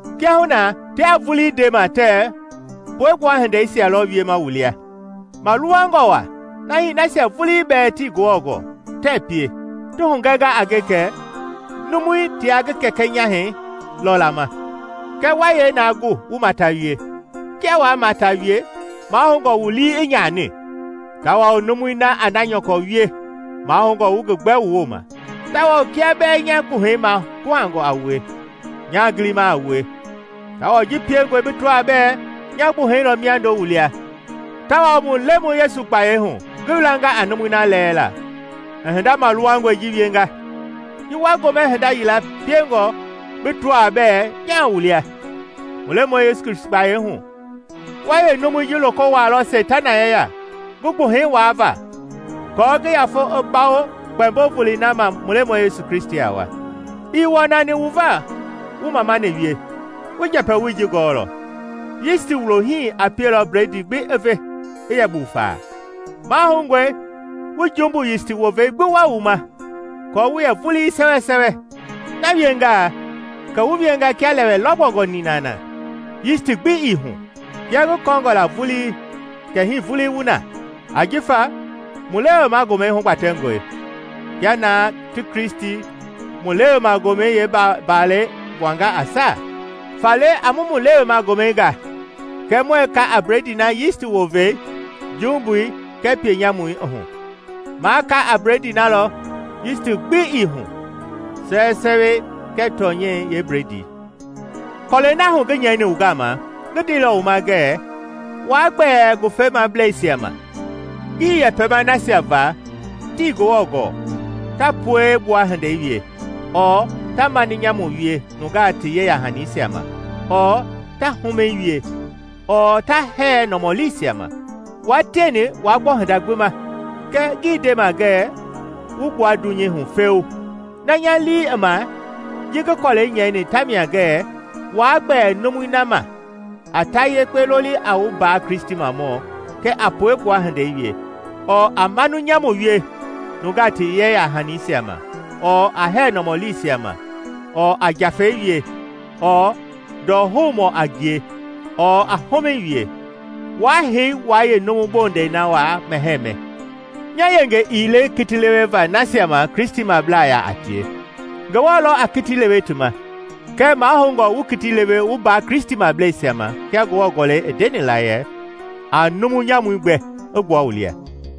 Kiahuna tiaa vulii ndema tɛɛ puegbua hindeisia lɔ wiema wu lia, maluwangɔ wa na hii nasia vulii bɛɛ tii Ngewɔ gɔɔ tɛɛ pie. Ti hugɛnga a nge kɛ numui tia ngi kɛkɛ nyahɛi lɔ lama. Kɛ wa yee na gu wu mata wie? Kia waa mata wie, mahoungɔ wu lii i nyani, tawao numui na a na nyɔkɔ wie, mahoungɔ wu ngi gbɛ wu wooma. Tawao kia bɛɛ nya gbuhɛi maguhangɔ a wue, nyaa gilima a wue; tawao ji piengɔe bi tɔaa bɛɛ nya gbuhɛi lɔ miando wu lia tawao mu Lemɔi Yesu gbayei hu ngi wilanga a numui na lɛɛla i hinda maluwangɔi ji wienga. Ji wa gomɛ hinda yila piengɔ bi tɔaa bɛɛ nyaa wu lia, mu Lemɔi Yesu gbayei hu, wa yeenumui ji loko wuaalɔ Seitana yeya ngi gbuhɛi waava aako ngi yafei i bawo Kpɛmbo Volei na ma mu Lemɔi Yesu a wa. Ii wɔnani wu va wu mamani wie! Wu njɛpɛwoi ji gɔɔlɔ: “Yisti wulo hii a pielɔ bledii gbi i ve i yɛ buufa.” Mahoungɔ wu jumbu yisti wovei gbi wua wu ma aako wu yɛ vulii sɛwɛsɛwɛ. Na wiengaa kɛ wu wienga kia lɛwɛ lɔgbɔngɔ nina na yisti gbi ii hu, kia ngi kɔɔngɔ la vulii kɛ hii vulii wu na. Ajifa mu Lewema Gomɛi hugbatɛngɔe, kia na ti Kristi, mu Lewema Gomɛi yeembalɛi gbuanga a saa. Faale a mu mu Lewema Gomɛi ga, kɛɛ muɛɛ ka a bledii na yisti wovei, jumbui kɛɛ pienyamui, i hu; ma ka a bledii na lɔ yisti gbi ii hu, sɛwɛsɛwɛi kɛɛ tɔnyɛi yeebledii. Kɔlɛi na hu ngi nyɛini wu gama ngi ndeilɔ wu ma ngɛɛ waa gbɛɛ ngawufemablɛisia ma. Ngii yɛpɛma nasia va tii Ngewɔ gɔɔ ta puegbua hindei wie, ɔɔ ta maninyamu wie nungaa ti yeya-hanisia ma, ɔɔ ta humɛi wie, ɔɔ ta hɛɛ nɔmɔliisia ma. Wua tieni waa gbɔ hinda gbi ma, kɛɛ ngii ndema ngɛ wu gbua dunyei hu feu. Na nya lii i ma ji ngi kɔlɛi nyɛini tamia ngɛɛ waa gbɛɛ numui na ma a ta yekpe loli a wu mbaa Kristimɔ kɛɛ a puegbua hindei wie, ɔɔ a mani nyamu wie nungaa ti yeya-hanisia ma, ɔɔ a hɛɛ nɔmɔliisia ma, ɔɔ a njafɛi wie, ɔɔ ndɔhoumɔɔ a ngie, ɔɔ a humɛi wie. Waa hei wua yeenumu bondɛi na waa mɛhɛɛ mɛ. Nya yenge ii le kiti leweva nasia ma Kristimablaa yaa a tie, Ngewɔ lɔ a kiti lewe ti ma. Kɛɛ mahoungɔ wu kiti lewe wu mbaa Kristimableisia ma kia Ngewɔ Gɔlɛi i ndeni la yɛ, “A numu nyamui gbɛ i gbua wu lia.”